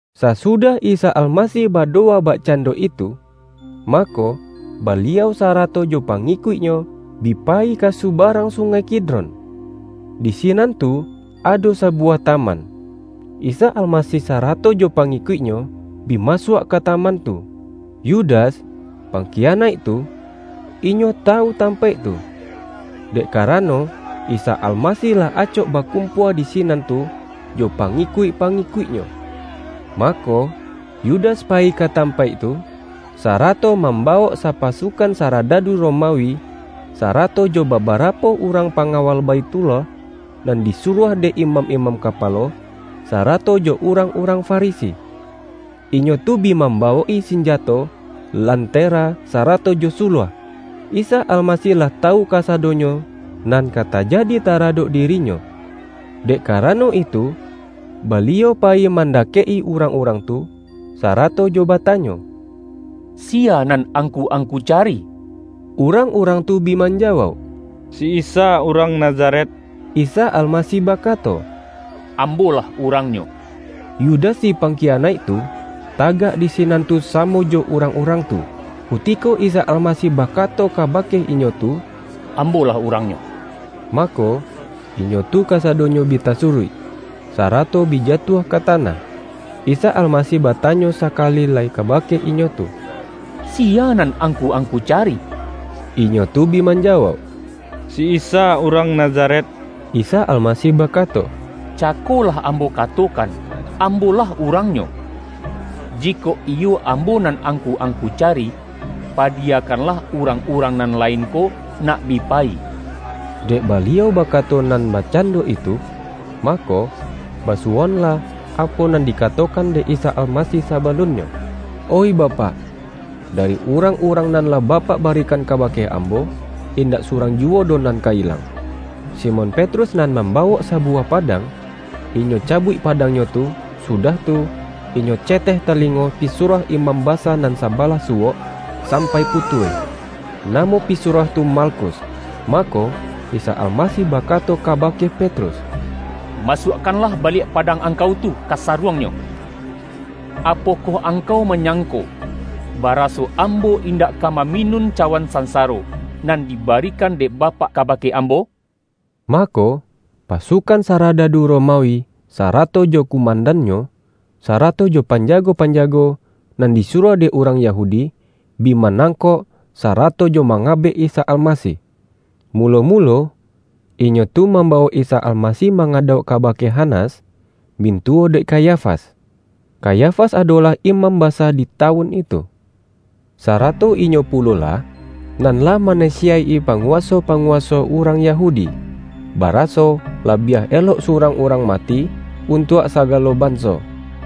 Sasudah Isa Almasih badowa bakcando itu, mako, Baliau sa-rato jo pangikuik-Nyo bi payi ka suba-rang Sungai Kidron. Di sinan tu ado sabuwah taman. Isa Almasih sarato jo pangikuik-Nyo bi masuak ka taman tu. Yudas, pangkiyanaik tu, inyo tawu tampaik tu; dek karano, Isa Almasih lah acok bakumpua di sinan tu jo pa-ngikuik-pangikuik-Nyo. Mako, Yudas payi ka tampaik tu, sarato mambawok sapasukan saradadu Romawi, sarato jo babarapo urang pangawal Baithullah, nan disuruah dek imam-imam kapalo, sarato jo urang-urang Farisi. Inyo tu bi mambawok-i sinjato, lantera sarato jo suluah. Isa Almasih lah tawu kasa-donyo nan ka tajadi taradok diri-Nyo. Dek karano itu, Baliau payi mandakek-i urang-urang tu, sarato jo batanyo,”Si-ya nan angku-angku cari?” Urang-urang tu bi manjawauk,”Si Isa Urang Nazaret.” Isa Almasih bakato,”Ambo-lah urangnyo.” Yudas si pangkiyanaik tu, tagak di sinan tu samo jo urang-urang tu. Kutiko Isa Almasih bakato kabake inyo tu,”Ambo-lah urangnyo,” mako, inyo tu kasadonyo bi tasuruik, sarato bi jatuah ka tanah. Isa Almasih ba-tanyo sakali lai kabake inyo tu,”Siya nan angku-angku cari?” Inyo tu bi manjawauk,”Si Isa urang Nazaret.” Isa Almasih bakato,”Cako lah Ambo katokan, Ambo-lah urang-nyo. Jikok iyo Ambo nan angku-ang-ku cari, padiyakanlah urang-urang nan lain ko nak bi payi.” Dek Baliau bakato nan bakcando itu, mako basu-woanlah, apo nan dikatokan dek Isa Almasih sabalunnyo:”Oih Bapak, da-ri urang-urang nan lah Bapak barikan kabake Ambo, indak surang juwo doh nan ka ilang.” Simon Petrus nan mambawok sa-buwah padang, inyo cabuik padang-nyo tu, sudah tu, inyo ceteh talingo pisuruah imam basa nan sabalah su-wok, sampai putuih. Namo pisuruah tu Malkus. Mako, Isa Almasih ba-kato kabake Petrus”Masuakkanlah baliak padang angkau tu ka saruang-nyo! Apokoh angkau manyangko, ba-raso Ambo indak ka maminun cawan sansaro, nan dibarikan dek Bapak ka-bake Ambo?” Mako, pasukan saradadu Roma-wi, sarato jo kumandannyo, sarato jo panjago-panjago nan disuruah dek urang Yahudi, bi manangkok, sarato jo mangabek Isa Almasih. Mulo-mulo, inyo tu mambawok Isa Almasih mangadauk kabake Hanas, mintuwo dek Kayafas. Kayafas adolah imam basa di tawun itu. Sarato inyo pulo-lah, nan lah manasiyaik-i panguwa-so-panguwaso urang Yahudi, baraso labiah elok surang urang mati, untuak sagalo banso.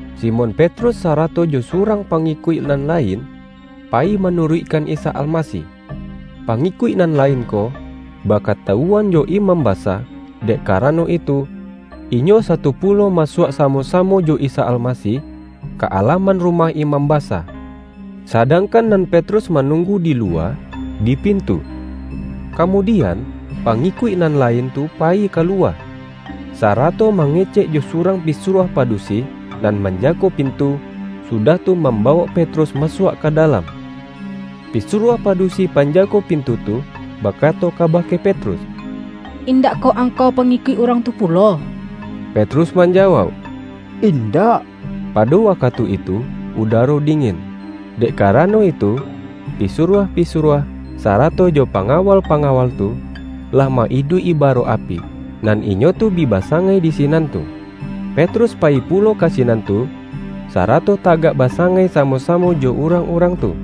Simon Petrus, sarato jo surang pa-ngikuik nan lain, payi manuruikkan Isa Almasih. Pangikuik nan lain ko, bakatawuan jo imam basa; dek kara-no itu, inyo sato pulo masuak samo-samo jo Isa Almasih, ka alaman rumah imam basa, sadangkan nan Petrus manunggu di luwa, di pintu. Kamudi-an, pangikuik nan lain tu payi kaluwa, sarato mangecek jo surang pisuruah padusi, nan manjago pintu, sudah tu, mambawok Petrus masuak ka dalam. Pisuruah padusi panjago pintu tu, bakato kabake Petrus,”Indakkoh ang-kau pangikuik Urang tu pulo?” Petrus manjawauk,”Indak.” Pado wakatu itu udaro dingin, dek karano itu, pisuruah-pisuruah, sara-to jo pangawal-pangawal tu, lah ma-iduik-i baro api, nan inyo tu bi basa-ngai di sinan tu. Petrus payi pulo ka sinan tu, sarato tagak basangai samo-samo jo urang-urang tu.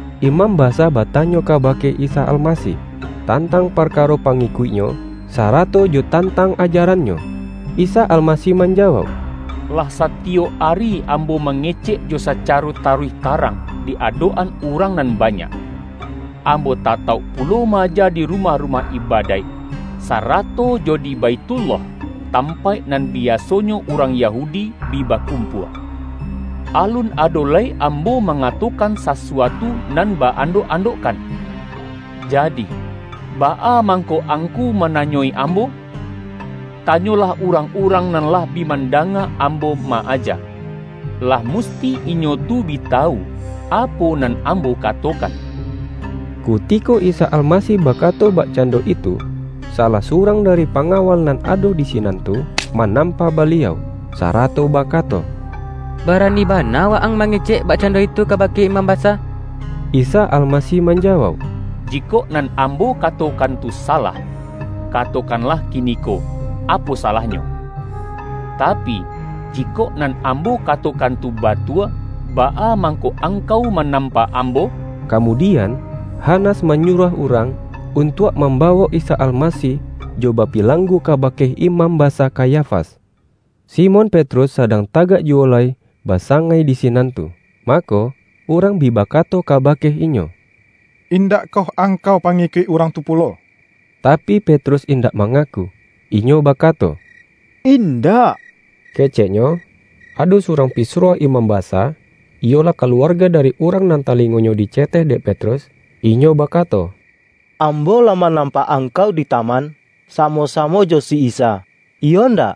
Imam basa batanyo kabake Isa Al-masih, tantang parkaro pangikuik-Nyo, sarato jo tantang ajaran-Nyo. Isa Al-masih manjawauk,”Lah satiyok ari Ambo mangecek jo sacaro taruih ta-rang, di adok-an urang nan banyak. Ambo tatauk pulo ma-aja di rumah-rumah ibadaik, sarato jo di Baithullah, tampaik nan biasonyo urang Yahudi bi bakumpua. Alun ado lai Ambo manga-tokan sasuatu nan ba-andok-andokkan. Jadi, baa mangko angku mananyoi Ambo? Tanyolah urang-urang nan lah bi mandanga Ambo ma-aja. Lah mus-ti inyo tu bi tawu apo nan Ambo ka-tokan.” Kutiko Isa Almasih bakato bak-cando itu, salah surang dari panga-wal nan ado di sinan tu, manampa Baliau, sarato bakato,”Barani bana Wa-ang mangecek bakcando itu ka-bake imam basa!” Isa Almasih manjawauk,”Jikok nan Ambo katokan tu salah, katokan-lah kiniko, apo salahnyo! Tapi, jikok nan Ambo katokan tu batua, baa mang-ko angkau manampa Ambo?” Kamudian, Hanas manyuruah urang, untuak mambawok Isa Almasih jo bapilanggu kabake Imam Basa Kayafas. Simon Petrus sadang tagak juwo lai basangai di sinan tu. Mako, urang bi bakato kabake inyo,”Indakkoh ang-kau pangikuik Urang tu pulo?” Tapi Petrus indak mangaku, inyo bakato,”Indak!” keceknyo. Ado surang pisuruah imam basa, iyolah kaluarga dari urang nan talingo-nyo diceteh dek Petrus, inyo bakato,”Ambo lah manampak angkau di taman samo-samo jo si Isa, iyo ndak?”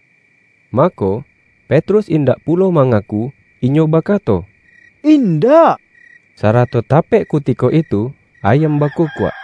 Mako, Petrus indak pulo manga-ku, inyo bakato,”Indak!” sarato ta-pek kutiko itu ayam bakukuak.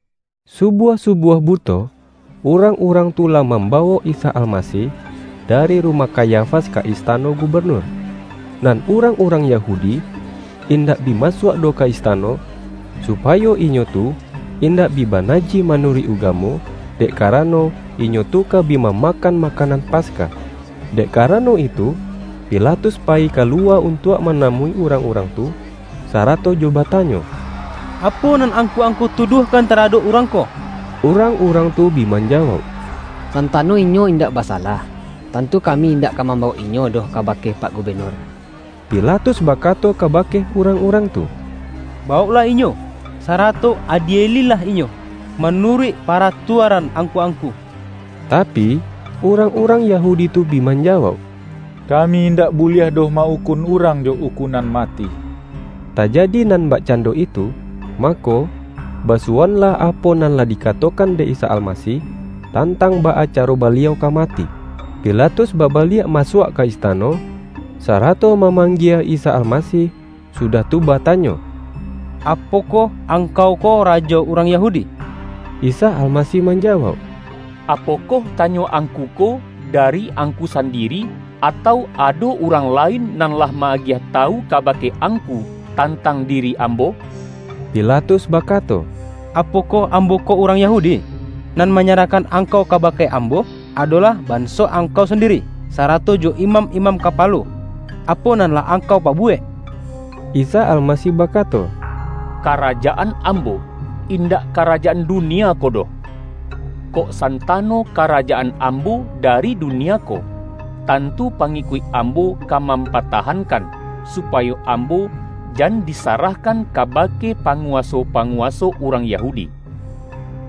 Subuah-subuah buto, urang-urang tu lah mambawok Isa Almasih, da-ri rumah Kayafas ka istano gubenur. Nan urang-urang Yahudi, indak bi ma-suak doh ka istano, supayo inyo tu indak bi banajih manuruik ugamo, dek karano, inyo tu ka bi mamakan ma-kanan Paskah. Dek karano itu, Pi-latus payi kaluwa untuak manamui urang-urang tu, sarato jo batanyo,”Apo nan angku-angku tuduahkan taradok Urang ko?” Urang-urang tu bi manjawauk,”Santano Inyo indak basalah, tantu kami indak ka mambawok Inyo doh kabake pak Gubenur.” Pilatus bakato kabake urang-urang tu,”Bawoklah Inyo, sarato adieli-lah Inyo manuruik paratuaran angku-angku!” Tapi, urang-urang Yahudi tu bi man-jawauk,”Kami indak buliah doh ma-ukun urang jo ukunan mati.” Tajadi nan bakcando itu, mako, basuwoanlah apo nan lah dikatokan dek Isa Almasih, tantang baa caro Baliau ka mati. Pilatus babaliak masuak ka ista-no, sarato mamanggie Isa Almasih, sudah tu, batanyo,”Apokoh Angkau ko Rajo urang Yahudi?” Isa Almasih manjawauk,”Apo-koh tanyo angku ko, dari angku san-diri, atau ado urang lain nan lah ma-agiah tawu kabake angku, tantang diri Ambo?” Pilatus bakato,”Apokoh ambo ko urang Yahudi? Nan manyarahkan Angkau kabake ambo, adolah ban-so Angkau sandiri, sarato jo imam-imam kapalo. Apo nan lah Angkau pabuwek?” Isa Almasih bakato,”Karajaan Ambo, indak karajaan dunia ko doh. Kok santano karajaan Ambo dari dunia ko, tantu pangikuik Ambo ka mampa-tahankan, supayo Ambo jan disarah-kan kabake panguwaso-panguwaso urang Yahudi.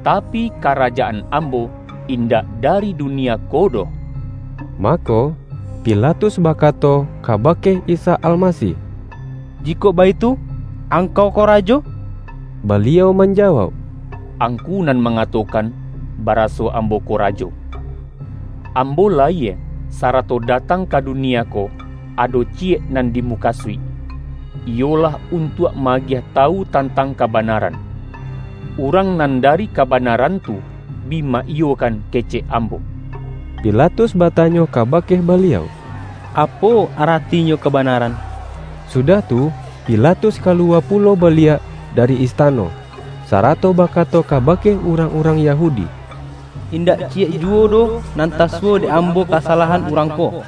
Tapi, karajaan Ambo indak dari dunia ko doh!” Mako, Pilatus bakato kabake Isa Almasih,”Jikok baitu, Angkau ko rajo?” Baliau manjawauk,”Angku nan ma-ngatokan baraso Ambo ko rajo. Am-bo layie, sarato datang ka dunia ko, ado ciyek nan dimukasuik, iyolah un-tuak ma-agiah tawu tantang kabana-ran. Urang nan dari kabanaran tu, bi ma-iyokan kecek Ambo.” Pilatus batanyo kabake Baliau,”Apo aratinyo kabanaran?” Sudah tu, Pilatus kaluwa pulo ba-liak dari istano, sarato bakato kabake urang-urang Yahudi,”Indak ciyek juwo doh nan tasuwo dek ambo kasalahan Urang ko.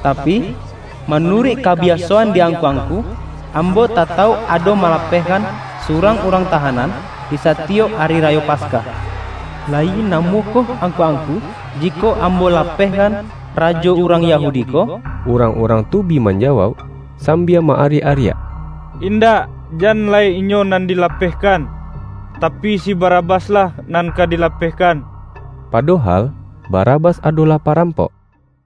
Tapi, manuruik kabiaso-an di angku-angku, ambo tatauk ado malapehkan surang urang tahanan, di satiyok Ari Rayo Paskah. Layi namuah koh angku-angku, jikok ambo lapeh-kan Rajo urang Yahudi ko?” Urang-urang tu bi manjawauk sam-bia ma-ariak-ariak,”Indak, jan lai Inyo nan dilapehkan, tapi si Barabas-lah nan ka dilapehkan!” (Padohal Bara-bas adolah parampok.) YAHYA